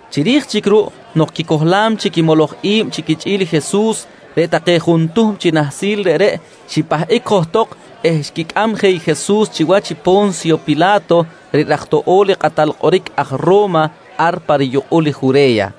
Chiri̱j chic ruꞌ nok quicohlam chic i moloj i̱b chi quichꞌi̱l i Jesus, reꞌ take juntuhm chi nahsil reꞌreꞌ xipahꞌic johtok eh xquicꞌam je i Jesus chiwach i Po̱nsyo Pila̱to reꞌ raj toꞌo̱l i kꞌatal kꞌoric aj Ro̱ma ar pa riyukꞌul i Jure̱ya.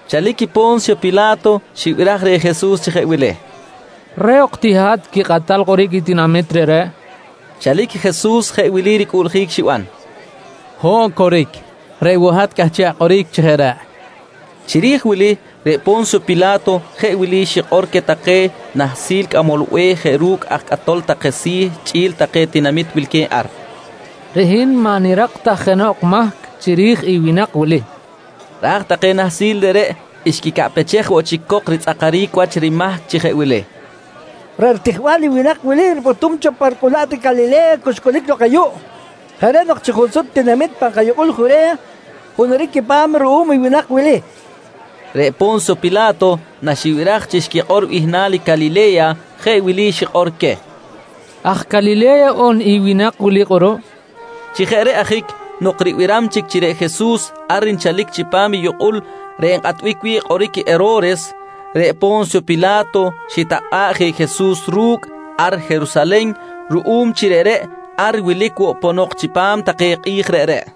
Chalic Po̱nsyo Pila̱to xibiraj reh Jesus chi jeꞌ wili: «Reꞌ ok ti hat quikꞌatal kꞌoric i tinamit reꞌreꞌ, nqui reh. Chalic Jesus jeꞌ wili ricꞌuꞌljic xiban: «Ho̱ꞌ, coric. Reꞌ woꞌ hat cꞌahchiꞌ akꞌoric chi jeꞌ reꞌ, nqui Jesus. Chiri̱j wili reꞌ Po̱nsyo Pila̱to jeꞌ wili xikꞌor queh take nahsil cꞌamol be̱h jeꞌ ru̱cꞌ aj cꞌatol take si̱ chꞌi̱l take tinamit wilque̱b ar: «Reꞌ hin maꞌ nirak ta jenoꞌ mahc chiri̱j i winak wili, nqui queh. Ra̱j take nahsil reꞌreꞌ xquicaꞌpechej woꞌ chic cok ritzꞌakaric wach rimahc chi jeꞌ wili: «Reꞌ ritijbal i winak wili ripꞌutum cho pa ricꞌulaꞌt i Calile̱ya cu xcꞌulic lok ayuꞌ. Jeꞌ reꞌ nok chi junsut tinamit pan kayukꞌul Jure̱ya hunuric quipa̱m ruꞌum i winak wili, nqui take reh. Reꞌ Po̱nsyo Pila̱to naxibiraj chi xquikꞌor bihnal i Calile̱ya jeꞌ wili xikꞌor queh: «Aj Calile̱ya on i winak wili kꞌuruꞌ? nqui xikꞌor queh. Chi jeꞌ reꞌ ajic nok ribiram chic chi reꞌ Jesus ar nchalic chipam i yukꞌul reꞌ nkꞌatbic wi̱ꞌ kꞌoric i Hero̱res, reꞌ Po̱nsyo Pila̱to xitakꞌa̱ꞌ je i Jesus ru̱cꞌ ar Jerusalen ruꞌum chi reꞌreꞌ ar wilic woꞌ ponok chipam take kꞌi̱j reꞌreꞌ.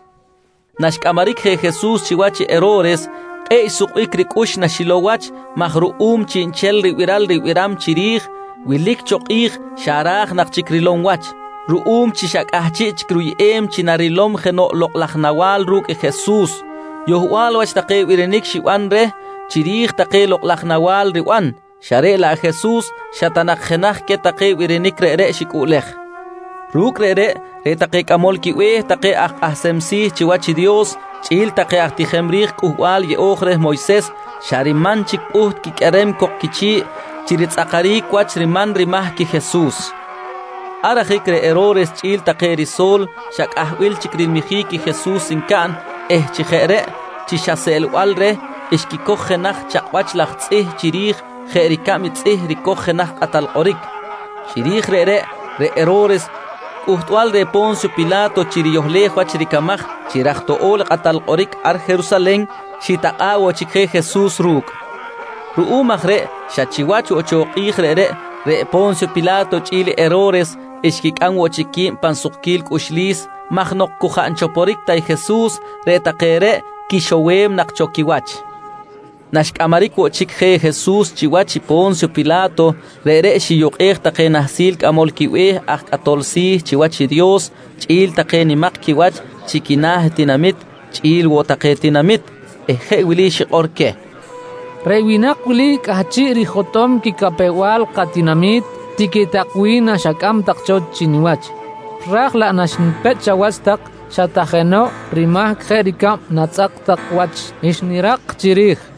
Naxcꞌamaric je Jesus chiwach i Hero̱res, kꞌe̱ꞌ xsukbic ricꞌux naxilow wach maj ruꞌum chiꞌnchel ribiral ribiram chiri̱j, wilic cho kꞌi̱j xa ra̱j nak chic rilow wach. Ruꞌum chi xa cꞌahchiꞌ chic ruyꞌem chi narilom jenoꞌ lokꞌ laj nawa̱l ru̱cꞌ Jesus, yohbal wach take birinic xiban reh chiri̱j take lokꞌ laj nawa̱l riban, xa reꞌ laꞌ i Jesus xa ta nak jenaj queh take birinic reꞌreꞌ xicꞌuꞌlej. Ru̱cꞌ reꞌreꞌ, reꞌ take cꞌamol quibe̱h take aj kꞌahsem si̱ chiwach i Dios chꞌi̱l take aj tijem ri̱j Cꞌuhbal Yeꞌo̱j reh Moyses xa riman chic pꞌuht quiqꞌuerem cok quichi̱ꞌ chi ritzꞌakaric wach riman rimahc i Jesus. Ar ajic reꞌ Hero̱res chꞌi̱l take riso̱l xa cꞌahbil chic rilmijic Jesus ncaꞌn eh chi jeꞌ reꞌ chi xa seꞌlbal reh, xquicoj jenaj chakꞌwach laj tzꞌih chiri̱j jeꞌ ricab i tzꞌih ricoj jenoꞌ kꞌatal kꞌoric. Chiri̱j reꞌreꞌ, reꞌ Hero̱res cꞌuhtbal reh Po̱nsyo Pila̱to chi riyohlej wach ricamaj chi raj toꞌo̱l i kꞌatal kꞌoric ar Jerusalen, xitakꞌa̱ꞌ woꞌ chic je Jesus ru̱cꞌ. Ruꞌum aj reꞌ xa chiwach woꞌ cho kꞌi̱j reꞌreꞌ, reꞌ Po̱nsyo Pila̱to chꞌi̱l Hero̱res xquicꞌam woꞌ chic qui̱b pan sukquil cꞌuxlis maj nok cu jaꞌ nchoporic ta i Jesus reꞌ take reꞌ quixowem nak cho quiwach. Naxcꞌamaric woꞌ chic je Jesus chiwach i Po̱nsyo Pila̱to, reꞌreꞌ xiyukꞌej take nahsil cꞌamol quibe̱h aj cꞌatol si̱ chiwach i Dios chꞌi̱l take nimak quiwach chi quina̱ tinamit chꞌi̱l woꞌ take tinamit eh jeꞌ wili xikꞌor queh: «Reꞌ winak wili cꞌahchiꞌ rijotꞌom quicapew-bal katinami̱t, tiqui tak wi̱n naxacꞌam tak cho chi niwach. Ra̱j laꞌ naxnipechꞌ chawach tak xa ta jenoꞌ rimahc jeꞌ ricab natzꞌak tak wach, xnirak chiri̱j.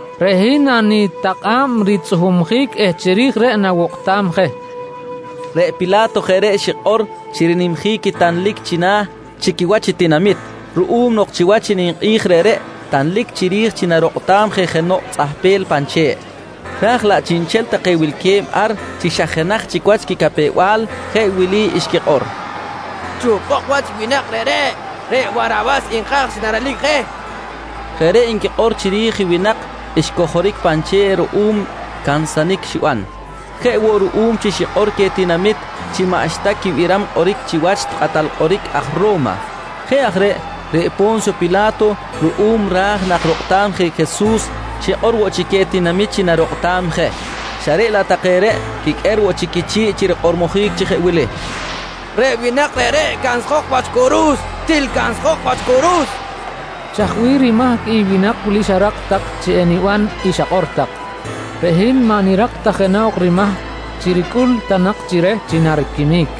reꞌ hin nanitakꞌa̱b ritzꞌuhumjic eh chiri̱j reꞌ nawokꞌtam je, nqui Po̱nsyo Pila̱to. Reꞌ Pila̱to jeꞌ reꞌ xikꞌor chi rinimjic i tanlic china̱ chi quiwach i tinamit, ruꞌum nok chiwach i ninkꞌi̱j reꞌreꞌ tanlic chiri̱j chi narokꞌtam je jenoꞌ tzꞌahpel pan che̱ꞌ. Raj laꞌ chiꞌnchel take wilque̱b ar chi xa jenaj chic wach quicapew-bal jeꞌ wili xquikꞌor: «Chuhpok wach i winak reꞌreꞌ. Reꞌ Warawas nka̱j chi narelic je, nqui take. Jeꞌ reꞌ nquikꞌor chiri̱j i winak xcojoric pan che̱ꞌ ruꞌum cansanic xiban, jeꞌ woꞌ ruꞌum chi xikꞌor queh tinamit chi maꞌxta quibiram kꞌoric chiwach kꞌatal kꞌoric aj Ro̱ma. Jeꞌ aj reꞌ, reꞌ Po̱nsyo Pila̱to ruꞌum ra̱j nak rokꞌtam je i Jesus xikꞌor woꞌ chic queh tinamit chi narokꞌtam je, xa reꞌ laꞌ take reꞌ quiqꞌuer woꞌ chic quichi̱ꞌ chi rikꞌormojic chi jeꞌ wili: «Reꞌ winak reꞌreꞌ cansjok wach curu̱s, til cansjok wach curu̱s, nqui take. —Chaj bih rimahc i winak wili xarak tak chi niban i xakꞌor tak? Reꞌ hin maꞌ nirak ta jenoꞌ rimahc chi ricꞌul ta nak chi reh chi nariquimic.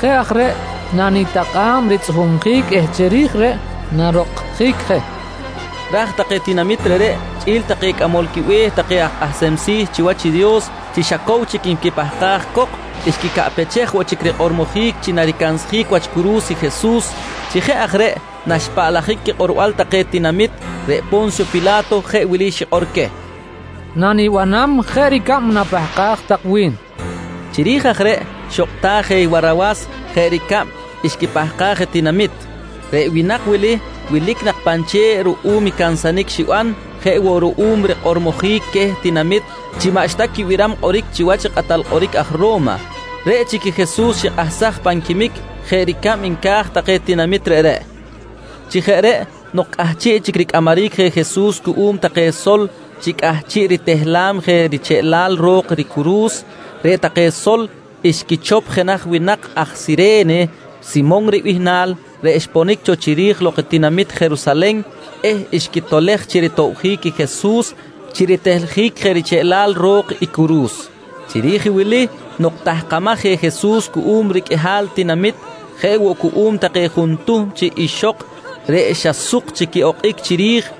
Jeꞌ aj reꞌ nanitakꞌa̱b ritzꞌuhumjic eh chiri̱j reꞌ narokꞌtjic je, nqui woꞌ chic Po̱nsyo Pila̱to queh pa ro̱x pech. Ra̱j take tinamit reꞌreꞌ chꞌi̱l take cꞌamol quibe̱h take aj kꞌahsem si̱ chiwach i Dios, chi xa cow chic nquipahkaj cok, xquicaꞌpechej woꞌ chic rikꞌormojic chi naricansjic wach curu̱s i Jesus. Chi jeꞌ aj reꞌ naxpaꞌlajic quikꞌorbal take tinamit, reꞌ Po̱nsyo Pila̱to jeꞌ wili xikꞌor queh: «Nanibanam jeꞌ ricab napahkaj tak wi̱n, nqui queh. Chiri̱j aj reꞌ xokꞌtaj je i Warawas jeꞌ ricab xquipahkaj i tinamit. Reꞌ winak wili wilic nak pan che̱ꞌ ruꞌum i cansanic xiban jeꞌ woꞌ ruꞌum rikꞌormojic queh tinamit chi maꞌxta quibiram kꞌoric chiwach i kꞌatal kꞌoric aj Ro̱ma. Reꞌ chic i Jesus xikꞌahsaj pan quimic jeꞌ ricab nca̱j take tinamit reꞌreꞌ. Chi jeꞌ reꞌ nok cꞌahchiꞌ chic ricꞌamaric je Jesus cuꞌum take sol chi cꞌahchiꞌ ritehlam je richeꞌlal ro̱k ricuru̱s, reꞌ take sol xquichop jenaj winak aj Sire̱ne Simon ribihnal reꞌ xponic cho chiri̱j lok i tinamit Jerusalen eh xquitolej chi ritobjic i Jesus chi ritehljic je richeꞌlal ro̱k i curu̱s. Chiri̱j i wili nok tahkamaj je Jesus cuꞌum riqꞌuihal tinamit, jeꞌ woꞌ cuꞌum take juntuhm chi ixok reꞌ xa suk chic quiꞌokꞌic chiri̱j,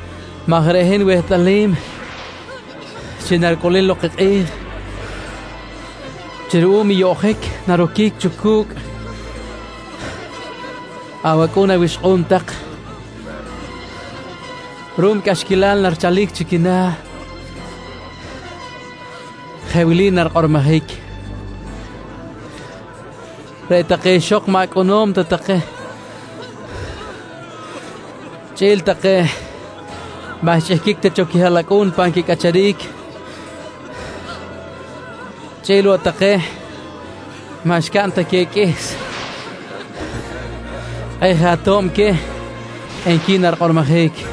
maj reꞌ hin wehtꞌalim chi naricꞌulic lok i kꞌi̱j chi ruꞌum i yoꞌjic naroquic cho cu̱cꞌ awacꞌu̱n awixkꞌu̱n tak ruꞌum i cꞌaxquilal narichalic chi quina̱, jeꞌ wili narikꞌormojic: ‹Reꞌ take ixok maꞌ acꞌunom ta take chꞌi̱l take maꞌ xchꞌihquic ta cho quihaꞌlacꞌu̱n pan quicꞌacharic chꞌi̱l woꞌ take maꞌ xcaꞌn ta queh i qꞌuihs, kꞌe̱ꞌ je ato̱b queh, nqui narikꞌormojic.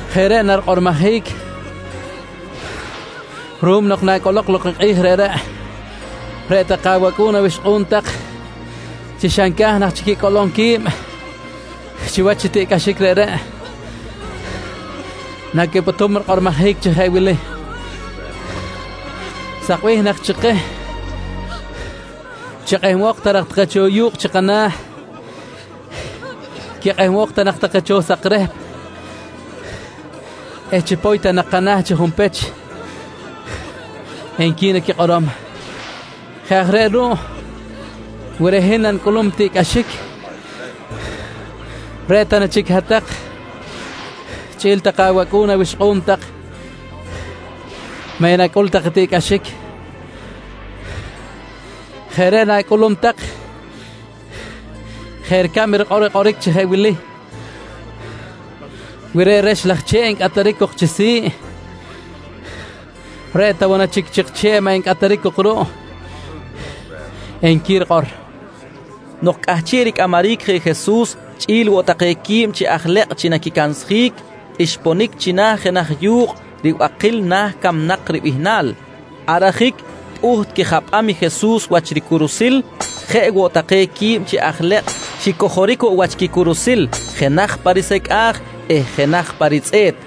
Jeꞌ reꞌ narikꞌormojic ruꞌum nok nacꞌolok lok i kꞌi̱j reꞌreꞌ, reꞌ take awacꞌu̱n awixkꞌu̱n tak chi xa nca̱j nak chic quicꞌolom qui̱b chiwach i tiꞌcꞌaxic reꞌreꞌ naquipꞌutum rikꞌormojic chi jeꞌ wili: ‹Sak bih nak chi keh chi quikꞌehbok ta nak take cho yu̱kꞌ chi kana̱, quikꞌehbok ta woꞌ nak chi kana̱ take sakrehp eh chipoy ta nak kana̱ chi junpech, nqui naquikꞌorom. «Jeꞌ aj reꞌ ruꞌ wi reꞌ hin nanicꞌulum i tiꞌcꞌaxic, reꞌ ta na chic hat-tak chꞌi̱l take awacꞌu̱n awixkꞌu̱n tak maꞌ enacꞌul tak tiꞌcꞌaxic? Jeꞌ reꞌ na̱cꞌulum tak jeꞌ ricab i kꞌoric rikꞌor chi jeꞌ wili: “Wi reꞌ rex laj che̱ꞌ ncꞌataric cok chi si̱ꞌ, reꞌ ta woꞌ na chic i chik che̱ꞌ maꞌ encꞌataric cok ruꞌ? nqui rikꞌor, nqui Jesus queh. Nok cꞌahchiꞌ ricꞌamaric je Jesus chꞌi̱l woꞌ take quib chi aj lekꞌ chi naquicansjic, xiponic china̱ jenaj yu̱kꞌ “Ribakil Na̱ Camnak” ribihnal. Ar ajic pꞌuht quijapꞌam i Jesus wach ricurusil. Jeꞌ woꞌ take quib chi aj lekꞌ xicojoric woꞌ wach quicuru̱s, jenaj pa risecꞌa̱j eh jenaj pa ritzꞌe̱t.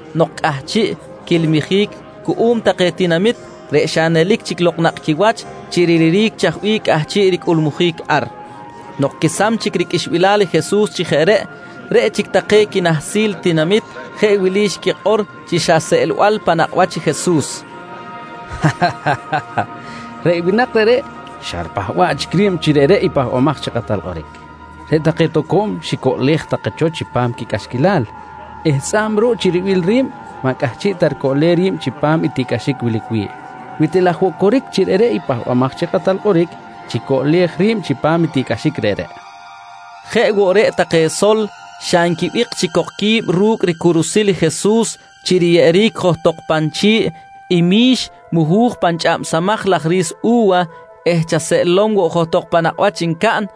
nok cꞌahchiꞌ quiꞌilmijic cuꞌum take tinamit reꞌ xa nelic chic lok nakꞌ quiwach chi riliric chaj bih cꞌahchiꞌ ricꞌulmujic ar. Nok quesam chic riqꞌuixbilal i Jesus chi jeꞌ reꞌ, reꞌ chic take quinahsil i tinamit jeꞌ wili xquikꞌor chi xa seꞌlbal pan nakꞌ wach i Jesus: «Reꞌ winak reꞌreꞌ xa ripahba̱ꞌ chic ri̱b chi reꞌreꞌ i Pahbamaj chi Kꞌatal Kꞌoric. Reꞌ take toco̱m xicoꞌlej take cho chipam quicꞌaxquilal eh tzꞌa̱b ruꞌ chi ribil ri̱b, maꞌ cꞌahchiꞌ ta ricoꞌlem ri̱b chipam i tiꞌcꞌaxic wilic wi̱ꞌ. Wi til aj woꞌ coric chi reꞌ i Pahbamaj chi Kꞌatal Kꞌoric, chicoꞌlej ri̱b chipam i tiꞌcꞌaxic reꞌreꞌ, nqui take. Jeꞌ woꞌ reꞌ take sol xa nquibik chic cok qui̱b ru̱cꞌ ricurusil i Jesus chi riyeꞌeric johtok pan chi̱ꞌ i mi̱x muhu̱j pan chꞌamsamaj laj ri̱s u̱wa eh chaseꞌlom woꞌ johtok pan nakꞌ wach ncaꞌn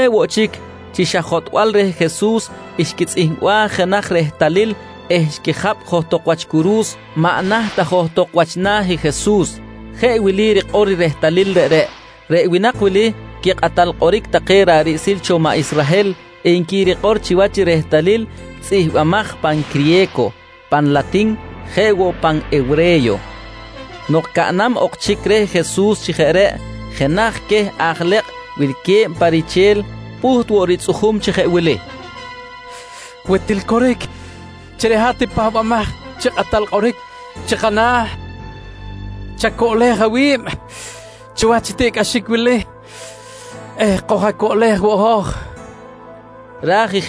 Jeꞌ woꞌ chic, chi xa jotꞌbal reh Jesus xquitzꞌihmbaj jenaj rehtalil eh xquijapꞌ johtok wach curu̱s maꞌ naht ta johtok wach na̱ i Jesus. Jeꞌ wili rikꞌor i ehtalil reꞌreꞌ: “Reꞌ winak wili quikꞌatal kꞌoric take ra̱ꞌ riꞌsil cho maꞌ Israhel, nqui rikꞌor chiwach i rehtalil tzꞌihmbimaj pan criye̱co, pan latin jeꞌ woꞌ pan hewre̱yo. Nok caꞌnam ok chic reh Jesus chi jeꞌ reꞌ, jenaj queh aj lekꞌ wilque̱b pa riche̱l pꞌuht woꞌ ritzꞌujum chi jeꞌ wili: «Wi til coric chi reꞌ hat i Pahbamaj chi Kꞌatal Kꞌoric chi kana̱, chacoꞌlej awi̱b chiwach i tiꞌcꞌaxic wili eh koj-acoꞌlej woꞌ hoj, nqui reh Jesus.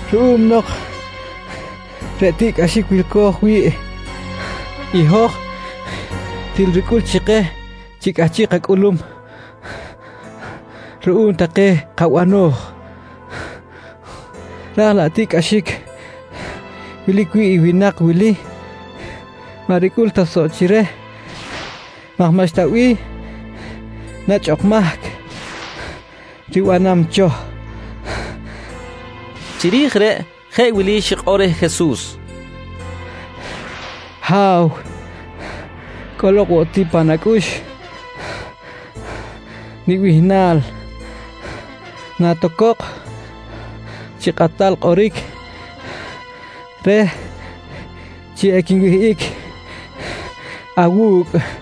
ruꞌum nok reꞌ tiꞌcꞌaxic wilco̱j wi̱ꞌ i hoj til ricꞌul chi keh chi cꞌahchiꞌ kacꞌulum ruꞌum take kabano̱j, ra̱j laꞌ tiꞌcꞌaxic wilic wi̱ꞌ i winak wili maꞌ ricꞌul ta soꞌ chi reh maj maꞌxta bih nechꞌ ok mahc ribanam cho, nqui richꞌi̱l reh. Chiri̱j reꞌ, jeꞌ wili xikꞌor reh Jesus: «Ha̱w, cꞌolok woꞌ ti pan acꞌux nibihnal natocok chi Kꞌatal Kꞌoric reh chi equinwihꞌic awu̱cꞌ, nqui reh.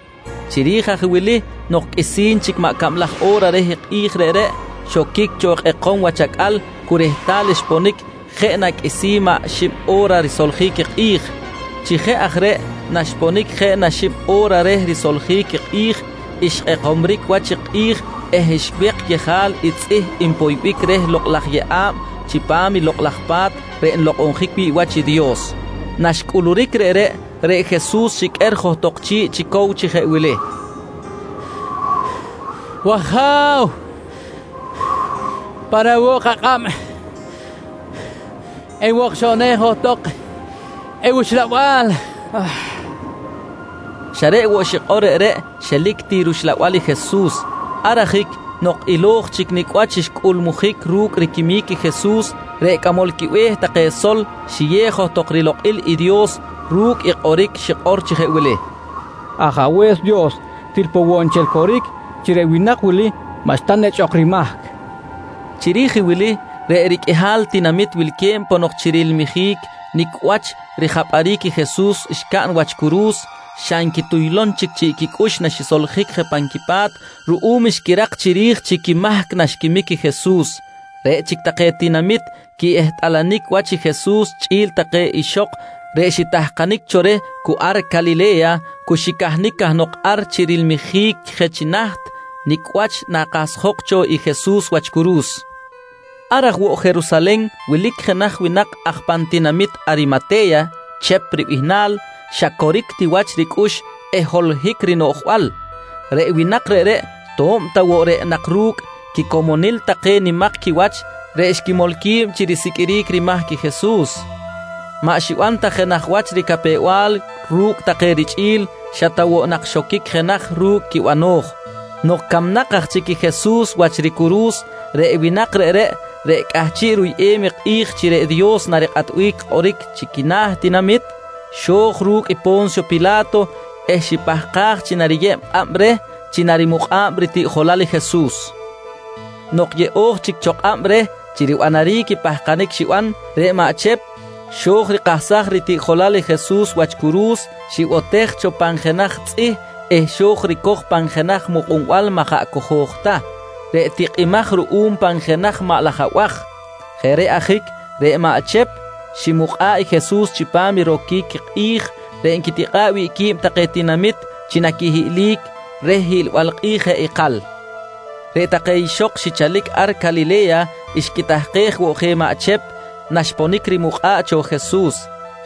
Chiri̱j aj wili nok qꞌuisi̱n chic maꞌ cablaj o̱ra reh kꞌi̱j reꞌreꞌ, xoquic cho kꞌekom wach acꞌal cu rehtal xponic jeꞌ na qꞌuisi̱n maꞌ xib o̱ra risoljic i kꞌi̱j. Chi jeꞌ aj reꞌ naxponic jeꞌ na xib o̱ra reh risoljic i kꞌi̱j, xkꞌekomric wach i kꞌi̱j eh xwek yejal i tzꞌih npoybic reh lokꞌ laj yeꞌa̱b chipam i Lokꞌ laj Pa̱t reꞌ nlokꞌonjic wi̱ꞌ wach i Dios. Naxcꞌuluric reꞌreꞌ, reꞌ Jesus xiqꞌuer johtok chi̱ꞌ chi cow chi jeꞌ wili: «W-Aja̱w, pan awo̱k akꞌab nwokxoꞌnej johtok i wuxlabal, nqui xikꞌor. Xa reꞌ woꞌ xikꞌor reꞌreꞌ, xelic ti ruxla̱b i Jesus. Ar ajic nok ilo̱j chic nicꞌ wach xcꞌulmujic ru̱cꞌ riquimic i Jesus, reꞌ cꞌamol quibe̱h take sol xiyew johtok rilokꞌil i Dios ru̱cꞌ i kꞌoric xikꞌor chi jeꞌ wili: «Ajabe̱s Dios, til poꞌ woꞌ nchel coric chi reꞌ winak wili maꞌxta nechꞌ ok rimahc, nqui xikꞌor. Chiri̱j i wili reꞌ riqꞌuihal tinamit wilque̱b ponok chi rilmijic nicꞌ wach rijapꞌaric i Jesus xcaꞌn wach curu̱s, xa nquituytuj chic chiꞌ quicꞌux naxisoljic je pan quipa̱t ruꞌum xquirak chiri̱j chi quimahc naxquimic i Jesus. Reꞌ chic take tinamit quiꞌehtꞌalanic wach i Jesus chꞌi̱l take ixok reꞌ xitahkanic cho reh cu ar Calile̱ya, cu xicahnic cahnok ar chi rilmijic je chi naht nicꞌ wach nakahsjok cho i Jesus wach curu̱s. Ar aj woꞌ Jerusalen wilic jenaj winak aj pan tinamit Arimate̱ya Chep ribihnal, xa coric ti wach ricꞌux eh holohic rinoꞌjbal. Reꞌ winak reꞌreꞌ to̱b ta woꞌ reꞌ nak ru̱cꞌ quicomonil take nimak quiwach reꞌ xquimol qui̱b chi risiqꞌuiric rimahc i Jesus, maꞌ xiban ta jenaj wach ricapew-bal ru̱cꞌ take richꞌi̱l xa ta woꞌ nak xoquic jenaj ru̱cꞌ quibano̱j. Nok camnak aj chic i Jesus wach ricuru̱s, reꞌ winak reꞌreꞌ, reꞌ cꞌahchiꞌ ruyꞌem i kꞌi̱j chi reꞌ Dios narikꞌatbic kꞌoric chi quina̱ ritinami̱t, xo̱j ru̱cꞌ i Po̱nsyo Pila̱to eh xipahkaj chi nariyeb kꞌab reh chi narimukꞌa̱b ritiꞌjolal i Jesus. Nok yeꞌo̱j chic cho kꞌab reh chi ribanaric i pahkanic xiban, reꞌ maꞌ Chep xo̱j rikahsaj ritiꞌjolal i Jesus wach curu̱s, xibotej cho pan jenaj tzꞌih eh xo̱j ricoj pan jenaj mukꞌunbal maꞌ jaꞌ cojo̱j ta, reꞌ tikꞌimaj ruꞌum pan jenaj maꞌ laj abaj. Jeꞌ reꞌ ajic reꞌ maꞌ Chep ximukꞌa̱ꞌ i Jesus chipam i roquic kꞌi̱j reꞌ nquitikꞌa̱ꞌ wi̱ꞌ qui̱b take tinamit chi naquihiꞌlic reh hiꞌlbal kꞌi̱j jeꞌ ikal. Reꞌ take ixok xichalic ar Calile̱ya xquitahkej woꞌ je maꞌ Chep naxponic rimukꞌa̱ꞌ cho Jesus.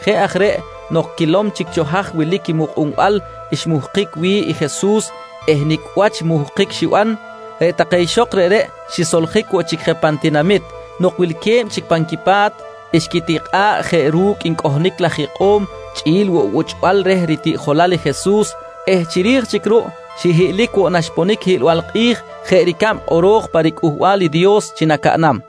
Jeꞌ aj reꞌ nok quilom chic cho haj wilic i mukꞌunbal xmuhkic wi̱ꞌ i Jesus eh nicꞌ wach muhkic xiban, reꞌ take ixok reꞌreꞌ xisoljic woꞌ chic je pan tinamit. Nok wilque̱b chic pan quipa̱t, xquitikꞌa̱ꞌ jeꞌ ru̱cꞌ ncꞌohnic laj ikꞌo̱m chꞌi̱l woꞌ buchꞌbal reh ritiꞌjolal i Jesus eh chiri̱j chic ruꞌ xihiꞌlic woꞌ naxponic i hiꞌlbal kꞌi̱j jeꞌ ricab kꞌoro̱j pa riCꞌuhbal i Dios chi nacaꞌnam.